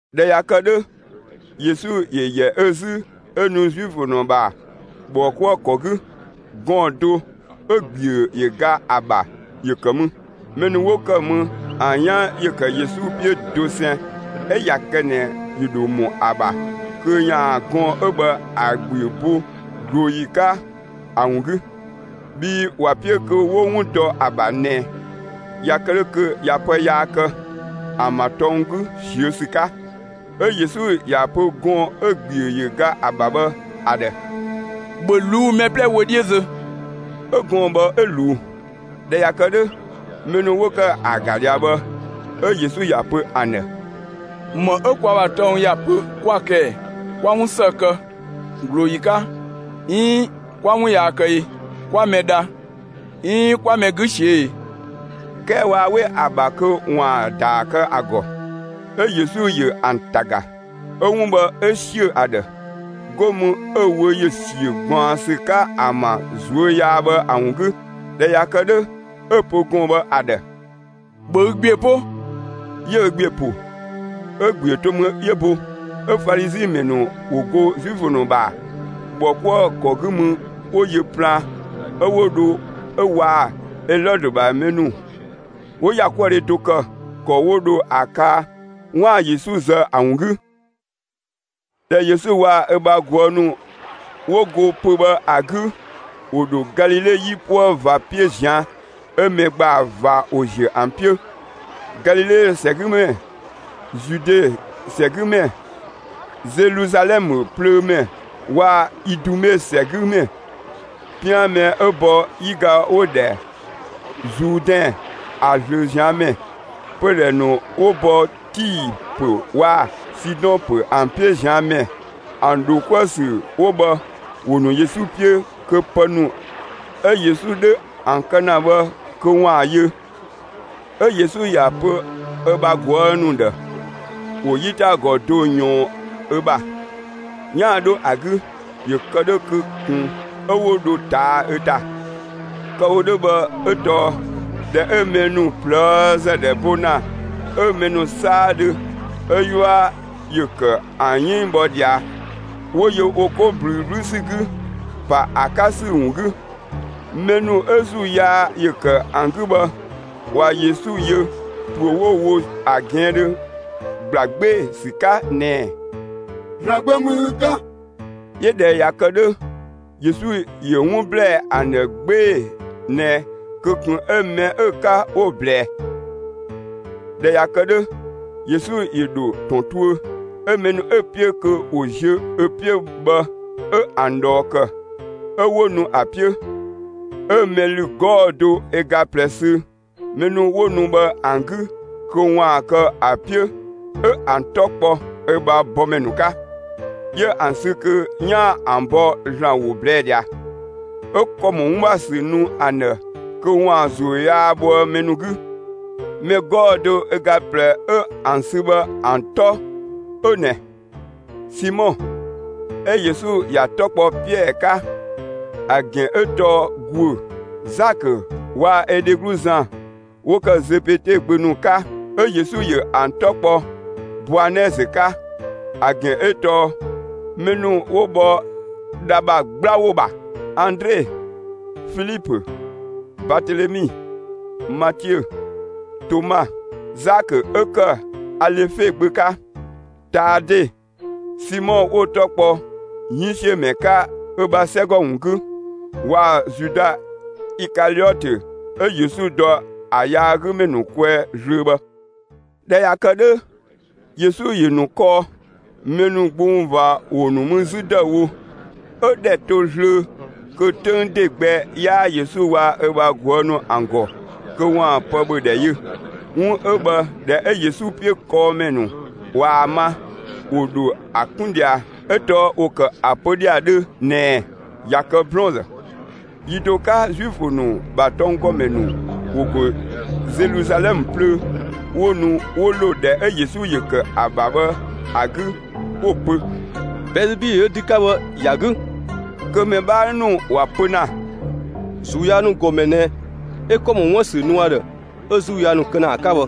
꞊Dhɛ ꞊ya kë 'dhö, Yesu ‑yö ‑yɛ ö 'zü 'ö nu Zuifö ‑nu ‑bha ‑bhɔkuëkɔ 'gü. Gɔɔn‑ do 'ö‑ ‑gbiö ‑yö ga ‑a ‑bha ‑yö ‑kë mü. Mɛ ‑nu 'wo ‑kë mü, ‑an 'yan ‑yö ‑kë Yesu 'piö dosɛn 'ö ꞊ya kë ꞊nɛ ‑yö ‑dho ‑mɔ ‑a ‑bha kö ‑yaan gɔɔn‑ 'ö bhë ‑a ‑gbiö bo ꞊glooyi 'ka ‑a ‑wun 'gü. Bhii ‑wa 'piö kö 'wo 'wun dɔ ‑a ‑bha ꞊nɛ, ꞊ya kë 'dhö kö ꞊ya pë yaa kë, ‑an ‑bha tɔng 'gü ꞊siö' ‑sü 'ka. 'Ö Yesu ‑ya pö gɔɔn‑ 'ö‑ ‑gbiö ‑yö ga ‑a ‑bha bhë ‑a ‑dhë: «‑Bhö ꞊luu'‑ mɛ 'plɛ wö 'dhiö zö!» 'Ö gɔɔn‑ bhë 'ö ꞊luu. ꞊Dhɛ ꞊ya kë 'dhö, mɛ ‑nu 'wo ‑kë ‑a ‑ga ꞊dhia bhë, 'ö Yesu ‑ya pö ‑an ‑dhë: «‑Më 'ö kwa ‑bha tɔng ‑ya pö 'kwa‑ kë ꞊ɛ? 'Kwa 'wun ‑së kë ꞊glooyi 'ka, 'iin 'kwa 'wun yaa kë e? 'Kwa mɛ dha, 'iin 'kwa mɛ 'gü ꞊siö'‑ e?» 'Kɛɛ waa 'we ‑a ‑bha kö ‑waan ‑daa kë ‑a ‑gɔ. 'Ö Yesu ‑yö ‑an ‑ta ‑ga, 'ö 'wun bhë 'ö ‑siö ‑a ‑dhë. 'Go mü 'ö‑ wö ‑yö ‑siö ꞊gbaɔnsü 'ka ‑an ‑bha ꞊zuö' yaa bhë ‑a ‑wun 'gü. ꞊Dhɛ ꞊ya kë 'dhö, 'ö‑ pö gɔɔn‑ bhë ‑a ‑dhë: «‑Bhö ü ‑gbiö 'po!» 'Yö ö ‑gbiö ‑po, 'ö‑ ‑gbiö to mü 'yö bo. 'Ö Falizi ‑mɛ ‑nu ‑wo go Zuifö ‑nu ‑bha ‑bhɔkuëkɔ 'gü mü 'wo yö plaan 'ö 'wo dho 'ö waa‑ Elɔdö ‑bha mɛ ‑nu 'wo ‑yakuëdhe do ‑kë, ‑kɔ 'wo dho ‑a kaa 'waan‑ Yesu zë ‑a ‑wun 'gü. ꞊Dhɛ Yesu waa‑ ö bha ꞊guë' ‑nu 'wo go pö‑ bhë ‑a 'gü, ‑wo ‑dho Galile 'yipuë ꞊va 'piö ꞊zian'. 'Ö mɛ ‑gbaa ꞊va ‑wo ‑ziö ‑an 'piö: Galile ‑sɛgümɛ, Zude ‑sɛgümɛ, Zeluzalɛmë plöömɛ waa‑ Idume ‑sɛgümɛ, 'pian mɛ 'ö bɔ 'yiga 'wo‑ ‑dhɛ Zuudɛn ‑a ꞊zlöö ꞊zian' ‑mɛ, pödhɛ ‑nu 'wo bɔ Tii ‑pö waa‑ Sidɔn ‑pö ‑an 'piö ꞊zian' ‑mɛ, ‑an ‑dho 'kuë‑ ‑sü 'wo bhë ‑wo ‑nu Yesu 'piö, kö pë ‑nu 'ö Yesu 'dhö ‑an kë ‑na bhë kö ‑waan yö. 'Ö Yesu ‑ya pö ö bha ꞊guë' ‑nu ‑dhë ‑wo 'yitagɔ do ꞊yɔɔn ö ‑bha, 'yaan‑ 'dho ‑a 'gü, ‑yö ‑kë 'dhö kö ꞊kun 'ö 'wo dho ꞊taa'‑ ö ‑ta. Kë‑ wo 'dhö bhë, 'ö tɔɔ ꞊dhɛ 'ö mɛ ‑nu ꞊plëëzë ‑dhɛ bo ‑na 'ö mɛ ‑nu 'saadhö 'ö 'yua ‑yö ‑kë ‑an 'yënng bhɔ ꞊dhia 'wo yö wo 'ko ꞊blüü 'blü ‑sü 'gü, ‑pa ‑a 'ka ‑sü ‑wun 'gü. Mɛ ‑nu 'ö ‑zuu yaa ‑yö ‑kë ‑an 'gü bhë, ꞊wa Yesu yö, ‑püö 'wo‑ wo ‑a ꞊gɛɛndhö, ‑gbla 'gbee‑ ‑sü 'ka ꞊nɛɛ: «‑Zlan Gbö ‑mü ü 'ka!» 'Yö ꞊dhɛ ꞊ya kë 'dhö, Yesu ‑yö 'wun ‑blɛɛ ‑an ‑dhë 'gbee‑ ꞊nɛ kö ꞊kun 'ö mɛ 'ö‑ 'ka 'wo‑ ꞊blɛɛ. ꞊Dhɛ ꞊ya kë 'dhö, Yesu ‑yö ‑dho ‑tɔn tuö, 'ö mɛ ‑nu 'ö‑ 'piö kö ‑wo ziö ö 'piö bhë 'ö ‑an ꞊dhɔɔ ‑kë, 'ö 'wo nu ‑a 'piö. 'Ö mɛ ‑lü 'gɔɔ‑ do ö ga ꞊plɛ sü mɛ ‑nu 'wo nu bhë ‑an 'gü kö ‑waan kë ö 'piö 'ö ‑an 'tɔ kpɔ ö bha bɔmɛ ‑nu 'ka, 'yö ‑an sü kö 'yaan‑ ‑an bɔ ‑Zlan ‑wo ꞊blɛɛ' ꞊dhia. 'Ö ‑kɔ ‑mɔ 'wun ‑bha ‑sü nu ‑an ‑dhë kö ‑waan ‑zuu yaa bhoë mɛ ‑nu 'gü. Mɛ 'gɔɔ‑ do ö ga ꞊plɛ 'ö ‑an sü bhë ‑an 'tɔ 'ö ꞊nɛ: Simɔ 'ö Yesu ‑ya 'tɔ kpɔ Piɛɛ 'ka, (‑a ‑gɛn 'ö tɔɔ «‑guö»,) Zakö waa‑ ö dheglu Zan 'wo ‑kë Zebede gbö ‑nu 'ka 'ö Yesu ‑yö ‑an 'tɔ kpɔ Boanɛɛzë 'ka (‑a ‑gɛn 'ö tɔɔ «mɛ ‑nu 'wo bhɔ dha ‑bha 'gbla ‑wo ‑bha»), Andre, Filipö, Baatelemi, Matiö, Toma, Zakö 'ö ‑kë Alefe gbö 'ka, Taade, Simɔ 'wo‑ 'tɔ kpɔ 'yënngsiömɛ 'ka ö ‑bha 'sɛgɔ ‑wun 'gü, waa‑ Zuda Ikaliɔtö 'ö Yesu dɔ ‑a yaagümɛ ‑nu kwɛɛ zlöö bhë. ꞊Dhɛ ꞊ya kë 'dhö, Yesu ‑yö ‑nu kɔɔ. Mɛ ‑nu gbung ꞊va ‑wo ‑nu mü 'zü ‑dëüwo, 'ö‑ ‑dhɛ to ꞊zlöö kö 'töng ‑de gbɛ 'yaa Yesu waa‑ ö bha ꞊guë' ‑nu ‑an ‑gɔ kö ‑waan pë ‑bhö ‑dhɛ yö. 'Wun 'ö bhë ꞊dhɛ 'ö Yesu 'piö kɔɔmɛ ‑nu ꞊waa‑ ma, 'wo dho ‑a 'kun ꞊dhia, 'ö tɔɔ ‑wo ‑kë ‑a pö ꞊dhia 'dhö ꞊nɛɛ: «꞊Ya kë 'blɔɔnzë.» Yi do 'ka Zuifö ‑nu ‑bha tɔnggɔmɛ ‑nu ‑wo ‑go Zeluzalɛmë plöö 'wo nu 'wo ‑lo ‑dhɛ 'ö Yesu ‑yö ‑kë ‑a ‑bha bhë ‑a 'gü, 'wo‑ pö: «Bɛɛzebilö 'ö dü 'ka bhë ‑ya 'gü.» Kö mɛ 'bhaa ‑nu ‑wa pö ‑na: «‑Zuu yaa ‑nu ‑gɔmɛ ꞊nɛ 'ö ‑kɔ ‑mɔ 'wuën‑ ‑sü nu ‑a ‑dhë 'ö ‑zuu yaa ‑nu kë ‑na ‑a 'ka bhë!»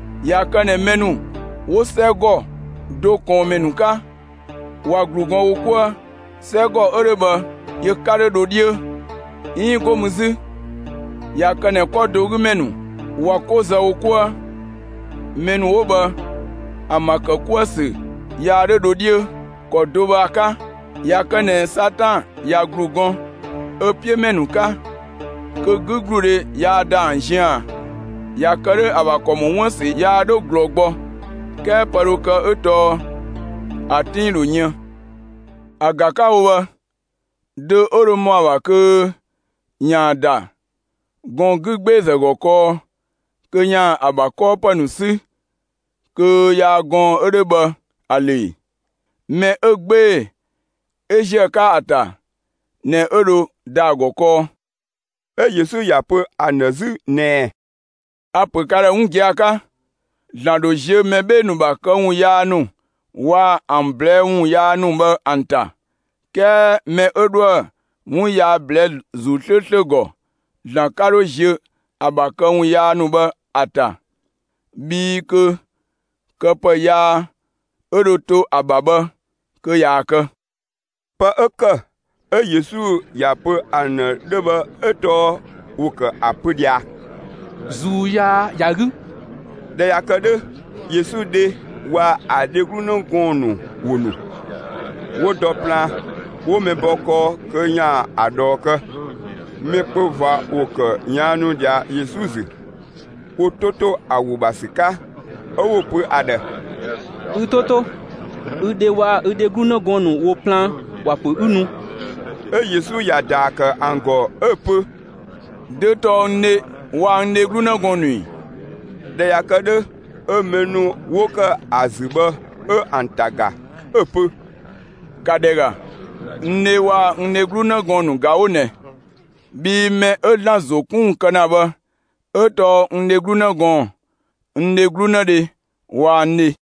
꞊Ya kë ꞊nɛ mɛ ‑nu 'wo 'sɛgɔ do ꞊kɔɔnmɛ ‑nu 'ka, ꞊wa ‑glu gɔn wo 'kuë, 'sɛgɔ 'ö 'dhö bhë yö 'ka 'dho dho 'dhiö. 'Iin 'go mü 'zü, ꞊ya kë ꞊nɛ 'kɔ do 'gü ‑mɛ ‑nu ꞊wa 'ko zë wo 'kuë, mɛ ‑nu 'wo bhë ‑an ‑bha ‑kë 'kuë‑ ‑sü yaa 'dho dho 'dhiö. ‑Kɔ do 'ö bhë ‑a 'ka, ꞊ya kë ꞊nɛ Satan ꞊ya ‑glu gɔn ö 'piö ‑mɛ ‑nu 'ka kö 'gügludhe yaa ‑da ‑an ziën ꞊a? ꞊Ya kë 'dhö ‑a ‑bha ‑kɔ ‑mɔ 'wuën‑ ‑sü yaa 'dho ꞊glɔɔ gbɔ; 'kɛɛ pë dho kë 'ö tɔɔ ‑a 'tinng ‑dho yën. ‑A ‑ga 'ka‑ wo bhë: Dö 'ö dho ‑mɔ ‑a ‑bha kö ‑yaan ‑da gɔɔn‑ 'gügbeezë ‑gɔ kɔɔ kö ‑yaan ‑a ‑bha 'kɔɔpë ‑nu 'sü kö yaa gɔɔn‑ 'ö 'dhö bhë ‑a ‑lö ‑e? Mɛ 'ö 'gbee‑ 'ö ‑ziö ‑a 'ka ‑a ‑ta ꞊nɛ 'ö dho ‑da ‑a ‑gɔ kɔɔ.» 'Ö Yesu ꞊ya pö ‑an ‑dhë 'zü ꞊nɛɛ: «A‑ ‑pö ka ‑dhë 'wun gia‑ 'ka: ‑Zlan ‑dho ziö mɛ 'bhee‑ ‑nu ‑bha këwun yaa ‑nu waa‑ ‑an ꞊blɛɛ'‑ ‑wun yaa ‑nu bhë ‑an ‑ta. 'Kɛɛ mɛ 'ö 'dhoë‑ 'wun yaa ꞊blɛɛ'‑ ‑Zuu 'slööslö ‑gɔ, ‑Zlan 'ka 'dho ziö ‑a ‑bha këwun yaa ‑nu bhë ‑a ‑ta. Bhii kö kë pë yaa 'ö dho to ‑a ‑bha bhë kö ꞊yaa‑ kë.» Pë 'ö ‑kë 'ö Yesu ‑ya pö ‑an ‑dhë 'dhö bhë 'ö tɔɔ ‑wo ‑kë ‑a pö ꞊dhia: «‑Zuu yaa ‑ya 'gü.» ꞊Dhɛ ꞊ya kë 'dhö, Yesu dhe waa‑ ‑a dheglu 'në gɔɔn‑ ‑nu ‑wo ‑nu; 'wo dɔ plaan, 'wo mɛ bɔ kɔɔ kö ‑yaan ‑a ꞊dhɔɔ kë. Mɛ kpö ꞊va ‑wo ‑kë ꞊yaannu ꞊dhia Yesu ‑zü, wo 'to ‑to ‑a ‑wo ‑bha ‑sü 'ka. 'Ö 'wo‑ pö ‑a ‑dhë: «Ü‑ 'to 'to, ü dhe waa‑ ü dheglu 'në gɔɔn‑ ‑nu ‑wo plaan, ‑wa ‑pö 'ü nu!» 'Ö Yesu ‑ya ‑daa ‑kë ‑an ‑gɔ 'ö‑ pö: «Dö tɔɔ n dhe waa‑ n dheglu 'në gɔɔn‑ ‑nu ‑i?» ꞊Dhɛ ꞊ya kë 'dhö, 'ö mɛ ‑nu 'wo ‑kë ‑a ‑zü bhë 'ö ‑an ‑ta ‑ga, 'ö‑ pö: «‑Ka ‑dhɛ ‑ga, n dhe waa‑ n dheglu 'në gɔɔn‑ ‑nu ꞊ga 'wo ꞊nɛ! Bhii mɛ 'ö ‑Zlan ‑zo 'kun ‑wun kë ‑na bhë 'ö tɔɔ n dheglu 'në gɔɔn‑, n dheglu 'në dhe waa‑ n dhe.»